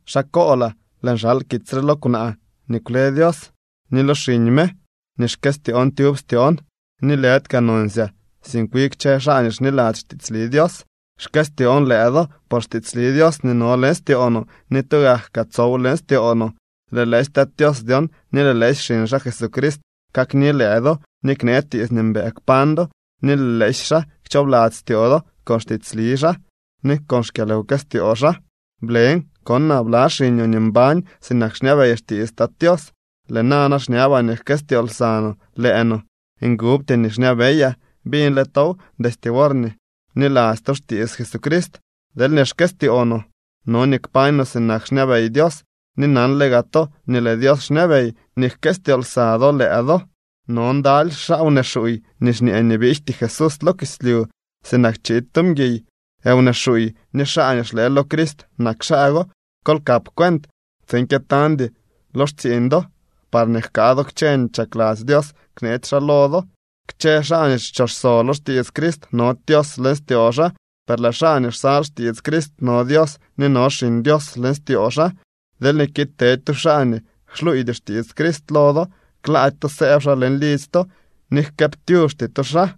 Xaa koolaa. Lëën xal kitsy re lo kwnaa nii kwle Dios ni lo xiñ me nii xkëstyoon tyub styoon, ni lëdy kaa nonsyaa, sink wi kchë xaa nii xniladzy xtiitsli Dios. Xkëstyoon lëë do por xtiitsli Dios nii no leñ styoo no ni tugak kaa tsow leñ styoo no. Lëë lëësy Tat Tios dyon ni lëë lëësy xiñ xaa Jesucrist kakni lëë do ni knee tiits nii mbëë kpañ do ni lëë lëësy xaa kchoobladzy styoo do con xtiitsli xaa ni con xkyalwkëstyoo xaa. Blen konaa bla xiñoo nii mbañ sinak xñabey xtiits Tat Tios. Lëë nana xñabaa nii jkëstyoo lsa no lëë no. Ngubty nii xñabeyaa. Biñle tow destye worñee bniladzy to xtiits Jesucrist. Deelñee xkëstyoo no, no nii kpañ no sinak xñabey Dios. Ni nanle gaa to nii lëë Dios xñabey nii jkëstyoo lsa do lëë do. No ndaly xaa wnee xuuy nii xñee nii biijty Jesús lo kislyu sinak chiid tu mguiy. Wnee xuuy ni xaa nii xlëë lo Crist nak xaa go. Kol kap cuent tsiin kyëtañdy lo xtsiiñ do parñee jkaa do kchë nii chakladzy Dios kneetsy xaa lo do. Kchë xaa nii kchoxso lo xtiits Crist nody Dios leñ styoo xaa. Per lëë xaa nii xsal xtiits Crist no Dios ni no Xiñ Dios leñ styoo xaa. Deelñee kiid tedy tu xaa nii xluuydy xtiits Crist lo do, klaady to sëëb xaa leñ lidzy to ni jkëëptyuxty to xaa.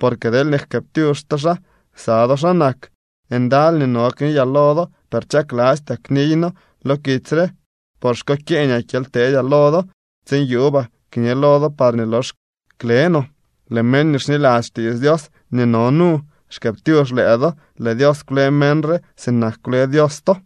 Porque deelñee jkëëptyux to xaa, ksa do xaa nak. Ndaly nii no kniyaa lo do, per chaklastyaa kniyno lo kitsy re, por xkokyeeñaa kyely teedyaa lo do, tsiin yuubaa kñe lo do parñee lox kle no. Lëë meñ nii xniladzy xtiits Dios nii no nu xkëëptyux lëë do. Lëë Dios kwle meñ re sinak kwle Dios to.